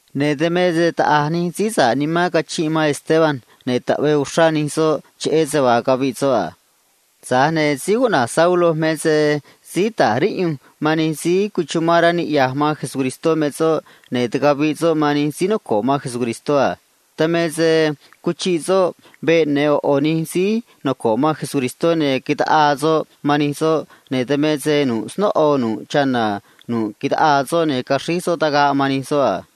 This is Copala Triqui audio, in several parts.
Ne̱ dan me se taꞌa̱j nij síí sa̱ꞌ nimán cachinꞌ man Esteban, ne̱ taꞌvee uxrá nij soꞌ cheꞌé se vaa caviꞌ soꞌ a. Tza̱j ne̱ síí cuꞌna̱j Saulo me se síí ta̱j riꞌyunj man xꞌneꞌ nij síí noco̱ꞌ man Jesús me soꞌ, ne̱ quiꞌyaj ndoꞌo soꞌ sayuun man nij soꞌ a. Dan me se cuchiꞌ soꞌ veꞌ ya̱nj ꞌo̱ ꞌo̱ nij síí noco̱ꞌ man Jesús, ne̱ taꞌaa soꞌ man nij soꞌ, ne̱ dan me se nu̱ꞌ snóꞌo nu̱ꞌ chana̱ nu̱ꞌ taꞌaa soꞌ, ne̱ caxríj soꞌ tagaꞌ man nij soꞌ a.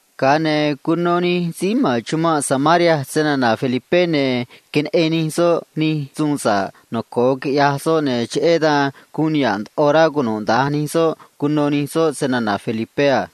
Ga̱a ne̱ cuno nij síí ma̱n chumanꞌ yoꞌ snana̱ Felipé, ne̱ queneꞌen nij soꞌ nij suun sa̱ꞌ noco̱o quiꞌyaj soꞌ, ne̱ cheꞌé dan sa̱ꞌ ndoꞌo nanó xre̱j cunuda̱nj nij soꞌ cuno̱ nij soꞌ snana̱ Felipé a.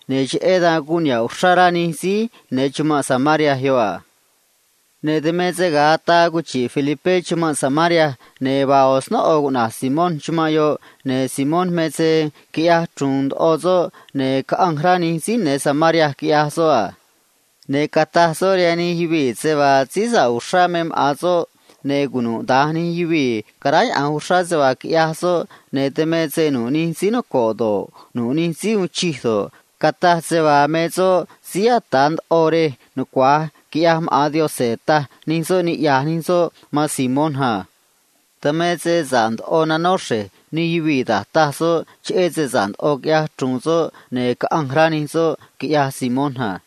ne̱ cheꞌé dan guun niha̱ꞌ uxrá rá nimán nij síí ya̱nj chumanꞌ yoꞌ a. Ne̱ dan me se ga̱a ataa cuchi̱ꞌ Felipé chumanꞌ yoꞌ, ne̱ vaa ꞌo̱ snóꞌo cuꞌna̱j Simón chumanꞌ yoꞌ, ne̱ Simón me se quiꞌyaj chru̱u̱n ndoꞌo soꞌ, ne̱ caꞌanj rá nij síí ma̱n Samaria, quiꞌyaj soꞌ a. Ne̱ cataj soꞌ rihaan nij yuvii̱ se vaa síí noco̱o uxrá me maꞌa̱n soꞌ a. Ne̱ cunuda̱nj nij yuvii̱ caráyaꞌa̱nj uxrá se vaa quiꞌyaj soꞌ, ne̱ dan me se nu̱ꞌ nij síí noco̱ꞌ do̱ꞌ, nu̱ꞌ nij síí uun chij do̱ꞌ, cataj se vaa me soꞌ síí ata̱ ndoꞌo rej nucua̱j, quiꞌyaj maꞌa̱n Yaꞌanj, taj nij soꞌ, niꞌya̱j nij soꞌ man Simón a. Dan me se sa̱ꞌ ndoꞌo nanó xre̱j nij yuvii̱ da̱j taj soꞌ, cheꞌé se neꞌen ndoꞌo soꞌ quiꞌya̱j chru̱u̱n soꞌ, ne̱ caꞌanj rá nij soꞌ, quiꞌyaj Simón a.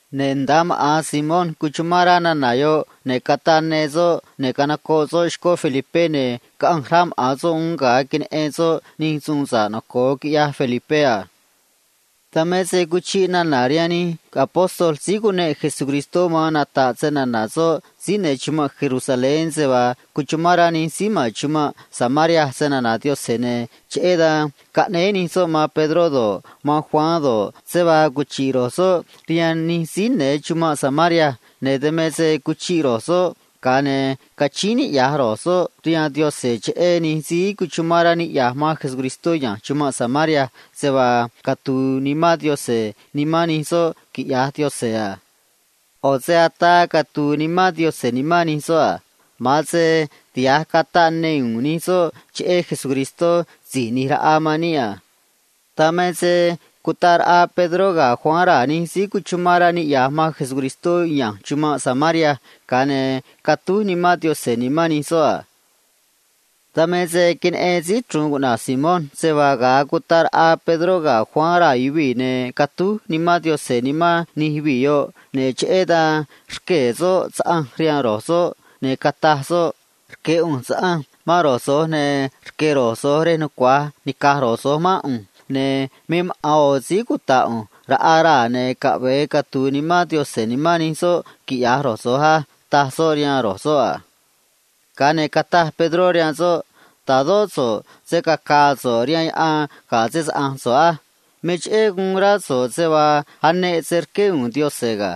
Ne̱ nda̱a maꞌa̱n Simón cuchumán rá nana̱ yoꞌ, ne̱ cataꞌ ne soꞌ, ne̱ ꞌo̱ chéé soꞌ ga̱ Felipé, ne̱ caꞌanj rá maꞌa̱n soꞌ uún ga̱a queneꞌen soꞌ da̱j a̱ nij suun sa̱ꞌ noco̱o quiꞌyaj Felipé a. Dan me se cuchiꞌ nana̱ rihaan nij síí cuneꞌ Jesús caꞌa̱nj nata̱ꞌ snana̱ soꞌ síí ma̱n chumanꞌ Jerusalén se vaa cuchumán rá nij síí ma̱n rej Samaria snana̱ Yaꞌanj a. Cheꞌé dan caꞌnéé nij soꞌ man Pedró do̱ꞌ, man Juan do̱ꞌ, se vaa cuchi̱ꞌ ro̱j soꞌ rihaan nij síí ma̱n Samaria a. Dan me se cuchiꞌ ro̱j soꞌ, ga̱a ne̱ cachíín niꞌya̱j ro̱j soꞌ rihaan Yaꞌanj cheꞌé nij síí cuchumán rá niꞌya̱j man Jesús ya̱nj Samaria se vaa catu̱u̱ Nimán Yaꞌanj nimán nij soꞌ quiꞌya̱j Yaꞌanj a. ꞌO̱ se ataa nani̱j Nimán Yaꞌanj catu̱u̱ Nimán Yaꞌanj nimán nij soꞌ a. Ma̱an se tiha̱j cataꞌ ne u̱u̱n nij soꞌ cheꞌé se‑chuvi̱i Jesús Si̱j ꞌNi̱j Raꞌa man níꞌ a. Dan me se cutaꞌ raꞌa Pedró ga̱ Juan raa̱ nij síí cuchumán rá niꞌya̱j man Jesús ya̱nj Samaria, ga̱a ne̱ catúj Nimán Yaꞌanj nimán nij soꞌ a. Dan me se queneꞌen síí chru̱u̱n cuꞌna̱j Simón se vaa ga̱a cutaꞌ raꞌa Pedró ga̱ Juan raa̱ yuvii̱, ne̱ catúj Nimán Yaꞌanj nimán nij yuvii̱ yoꞌ a. Cheꞌé dan rquee̱ soꞌ saꞌanj rihaan ro̱j soꞌ, ne̱ cataj soꞌ a: ―Rque̱ ꞌu̱nj saꞌanj man ro̱j so̱j, ne̱ rque̱ ro̱j so̱j se nucua̱j nica̱j ro̱j so̱j mán ꞌu̱nj, ne̱ me maꞌa̱n ꞌo̱ síí cuta̱ꞌ ꞌu̱nj raꞌaj raa̱, ne̱ caꞌve̱e catu̱u̱ Nimán Yaꞌanj nimán nij soꞌ, quiꞌya̱j ro̱j so̱j á ―taj soꞌ rihaan ro̱j soꞌ a. Ga̱a ne̱ cataj Pedró rihaan soꞌ a: ―Ta̱dó so̱ꞌ se̱ cacaa so̱ꞌ rihaan yaꞌan ga̱ se‑saꞌa̱nj so̱ꞌ á. Me cheꞌé guun rá so̱ꞌ se vaa aneꞌ se rqué u̱u̱n Yaꞌanj ga̱.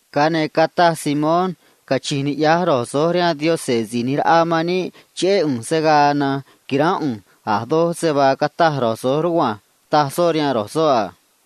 Ga̱a ne̱ cataj Simón a: ―Cachi̱nj niꞌya̱j ro̱j so̱j rihaan Yaꞌanj Si̱j ꞌNi̱j Raꞌa man níꞌ cheꞌé ꞌu̱nj se̱ gaa na̱nj qui̱ránꞌ ꞌu̱nj a̱ doj se vaa cataj ro̱j so̱j rugua̱nj ―taj soꞌ rihaan ro̱j soꞌ a.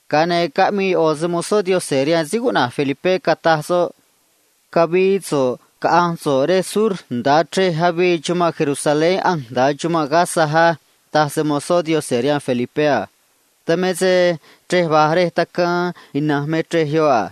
Ga̱a ne̱ caꞌmii ꞌo̱ se‑mo̱zó Yaꞌanj rihaan síí cuꞌna̱j Felipé, cataj soꞌ a: ―Cavi̱i̱ so̱ꞌ, caꞌa̱nj so̱ꞌ rej sur nda̱a chrej avii chumanꞌ Jerusalén ꞌanj nda̱a chumanꞌ cuꞌna̱j Gaza á ―taj se‑mo̱zó Yaꞌanj rihaan Felipé a. Dan me se chrej va̱j rej tacaan ina̱nj me chrej yoꞌ a.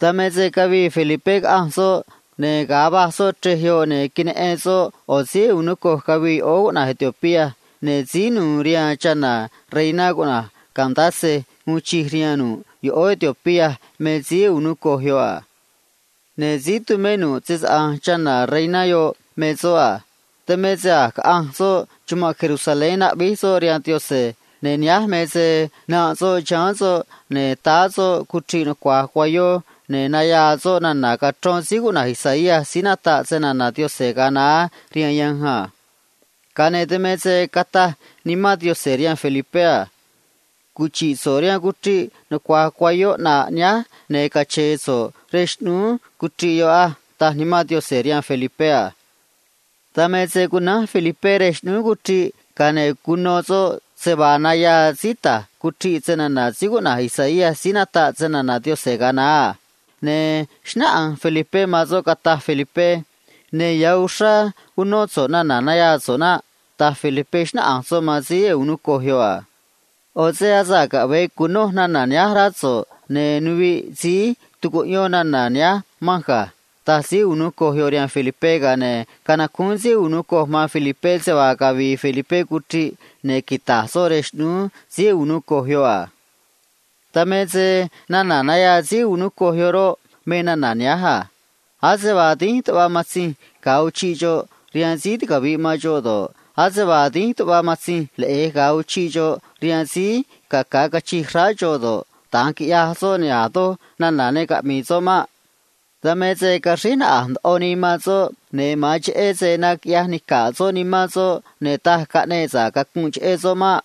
Dan me se cavii Felipé, caꞌanj soꞌ, ne̱ ga̱a va̱j soꞌ chrej yoꞌ, ne̱ queneꞌen soꞌ ꞌo̱ síí “eunuco” cavii yoꞌóó cuꞌna̱j Etiopía, ne̱ síí nu̱u̱ rihaan chana̱ reiná cuꞌna̱j Candace uun chij rihaan nu̱ꞌ yoꞌóó Etiopía me síí “eunuco” yoꞌ a. Ne̱ síí tumé nu̱ꞌ se‑saꞌa̱nj chana̱ reiná yoꞌ me soꞌ a. Dan me se a̱j caꞌanj soꞌ chumanꞌ Jerusalén cara̱a̱ gue̱e̱ soꞌ rihaan Yaꞌanj, ne̱ nihánj me se nanꞌ soꞌ chiháán soꞌ a. Táá soꞌ cuchriꞌ nucua̱j cuayó, ne̱ nayaa soꞌ nana̱ cachrón síí cuꞌna̱j Isaías síí nataꞌ snana̱ Yaꞌanj ga̱a naá rihaan yanj a. Dan me se cataj Nimán Yaꞌanj rihaan Felipé a: ―Quinichru̱nꞌ so̱ꞌ rej va̱j cuchriꞌ nucua̱j cuayó ꞌnaꞌ nihánj, ne̱ cache̱e̱ so̱ꞌ rej xꞌnúú cuchriꞌ yoꞌ á ―taj Nimán Yaꞌanj rihaan Felipé a. Dan me se cunánj Felipé rej xꞌnúú cuchriꞌ, ga̱a ne̱ cuno soꞌ se vaa nayaa síí ta̱j cuchriꞌ snana̱ síí cuꞌna̱j Isaías síí nataꞌ snana̱ Yaꞌanj ga̱a naá a. Ne̱ xnáꞌanj Felipé man soꞌ, cataj Felipé a: ―Ya̱ uxrá unó so̱ꞌ nana̱ nayaa so̱ꞌ naꞌ ―taj Felipé, xnáꞌanj soꞌ man síí “eunuco” yoꞌ a. ―Asa̱ꞌ caꞌve̱e cu̱noj nana̱ nihánj rá so̱ꞌ, ne̱ nuviꞌ síí tu̱cuꞌyón nana̱ nihánj manj ga̱ ―taj síí “eunuco” yoꞌ rihaan Felipé a. Ga̱a ne̱ canacúún síí “eunuco” man Felipé se vaa cavi̱i̱ Felipé cuchriꞌ ne̱ quita̱j soꞌ rej xꞌnúú síí “eunuco” yoꞌ a. Dan me se nana̱ nayaa síí “eunuco” yoꞌ rihaan Danj Yaꞌanj roꞌ, me nana̱ nihánj a: Ase vaa dínj tuꞌva matzinj ga̱a uchiꞌ xoꞌ rihaan síí ticavi̱ꞌ man xoꞌ do̱ꞌ, ase vaa dínj tuꞌva matzinj leꞌe̱j ga̱a uchiꞌ xoꞌ rihaan síí caca̱ cachij xráá xoꞌ do̱ꞌ, da̱nj quiꞌyaj soꞌ, ne̱ a̱ doj nana̱ ne caꞌmi̱i̱ soꞌ maꞌ. Dan me se caxríj naꞌa̱j ndoꞌo nii man soꞌ, ne̱ ma̱an cheꞌé se naquiꞌyaj nica̱ꞌ soꞌ nimán soꞌ, ne̱ taj caꞌneꞌ sa̱ꞌ cacunꞌ cheꞌé soꞌ maꞌ.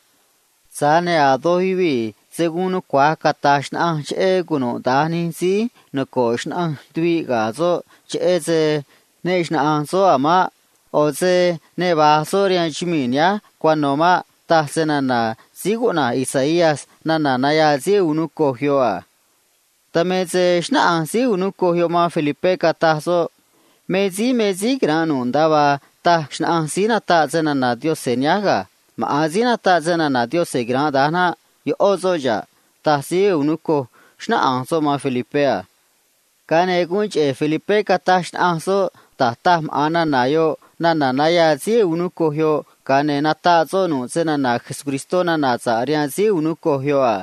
Tza̱j ne̱ a̱ doj yuvii̱ se̱ guun nucua̱j cata̱j xnaꞌanj cheꞌé cunuda̱nj nij síí noco̱ꞌ xnaꞌanj tuvi̱ꞌ ga̱ soꞌ, cheꞌé se ne xnaꞌa̱nj soꞌ a̱ maꞌ. ꞌO̱ se ticaviꞌ nii man soꞌ ne̱ ne va̱j soꞌ rihaan chumii̱ nihánj cuano̱ maꞌ, taj snana̱ síí cuꞌna̱j Isaías nana̱ nayaa síí “eunuco” yoꞌ a. Dan me se xnáꞌanj síí “eunuco” yoꞌ man Felipé, cataj soꞌ a: ―Rqueé ꞌu̱nj mán so̱ꞌ cata̱j so̱ꞌ me síí me síí quira̱nꞌ nu̱ꞌ nda̱a vaa taj xnaꞌanj síí nataꞌ snana̱ Yaꞌanj nihánj á. Maꞌa̱n síí nataꞌ snana̱ Yaꞌanj quira̱nꞌ da̱nj naꞌ. ꞌÓ soꞌ xa̱ꞌ ―taj síí “eunuco” yoꞌ, xnáꞌanj soꞌ man Felipé a. Ga̱a ne̱ guun cheꞌe̱ Felipé cataj xnaꞌanj soꞌ da̱j taj maꞌa̱n nana̱ yoꞌ nana̱ nayaa síí “eunuco” yoꞌ, ga̱a ne̱ nataꞌ soꞌ nana̱ sa̱ꞌ cheꞌé Jesús rihaan síí “eunuco” yoꞌ a.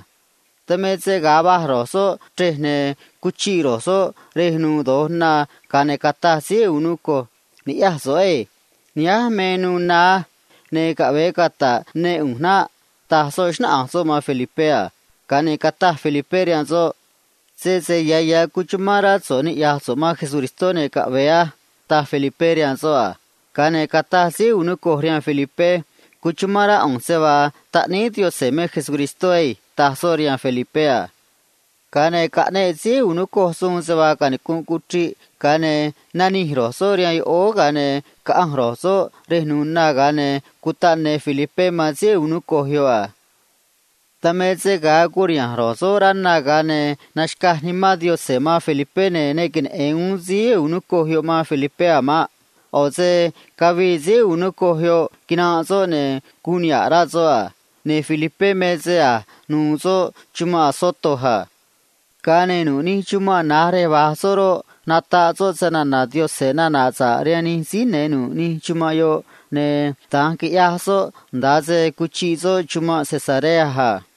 Dan me se ga̱a va̱j ro̱j soꞌ chrej, ne̱ cuchiꞌ ro̱j soꞌ rej nu̱u̱ do̱j na, ga̱a ne̱ cataj síí “eunuco” a: ―Ni̱ꞌyaj so̱ꞌ á. Nihánj me nu̱u̱ na á. Ne̱ caꞌve̱e cata̱ꞌ ne ꞌu̱nj naꞌ ―taj soꞌ, xnáꞌanj soꞌ man Felipé a. Ga̱a ne̱ cataj Felipé rihaan soꞌ a: ―Sese ya̱ ya̱ amán rá so̱ꞌ niꞌya̱j so̱ꞌ man Jesucristó, ne̱ caꞌve̱e a ―taj Felipé rihaan soꞌ a. Ga̱a ne̱ cataj síí “eunuco” rihaan Felipé a: ―Amán rá ꞌu̱nj se vaa taꞌníí Yaꞌanj me Jesucristó á ―taj soꞌ rihaan Felipé a. Ga̱a ne̱ caꞌneꞌ síí “eunuco” suun se vaa canicu̱nꞌ cuchriꞌ, ga̱a ne̱ nanij ro̱j soꞌ rihaan yoꞌóó, ga̱a ne̱ caꞌanj ro̱j soꞌ rej nu̱u̱ na, ga̱a ne̱ cutaꞌ ne Felipé man síí “eunuco” yoꞌ a. Dan me se ga̱a curiha̱nj ro̱j soꞌ rá na, ga̱a ne̱ naxca̱j Nimán Yaꞌanj man Felipé, ne̱ ne queneꞌe̱n uún síí “eunuco” yoꞌ man Felipé a̱ maꞌ. ꞌO̱ se cavii síí “eunuco” yoꞌ, quinanꞌ soꞌ, ne̱ guun niha̱ꞌ ya̱ rá nimán soꞌ a. Tza̱j ne̱ Felipé me se a̱j nuû soꞌ chumanꞌ Azoto a. Ga̱a ne̱ nu̱ꞌ nij chumanꞌ na̱j rej va̱j soꞌ roꞌ, nataꞌ soꞌ nana̱ sa̱ꞌ cheꞌé Jesús rihaan nij yuvii̱, ne̱ da̱nj quiꞌyaj soꞌ nda̱a se cuchiꞌ soꞌ nda̱a chumanꞌ Cesarea a.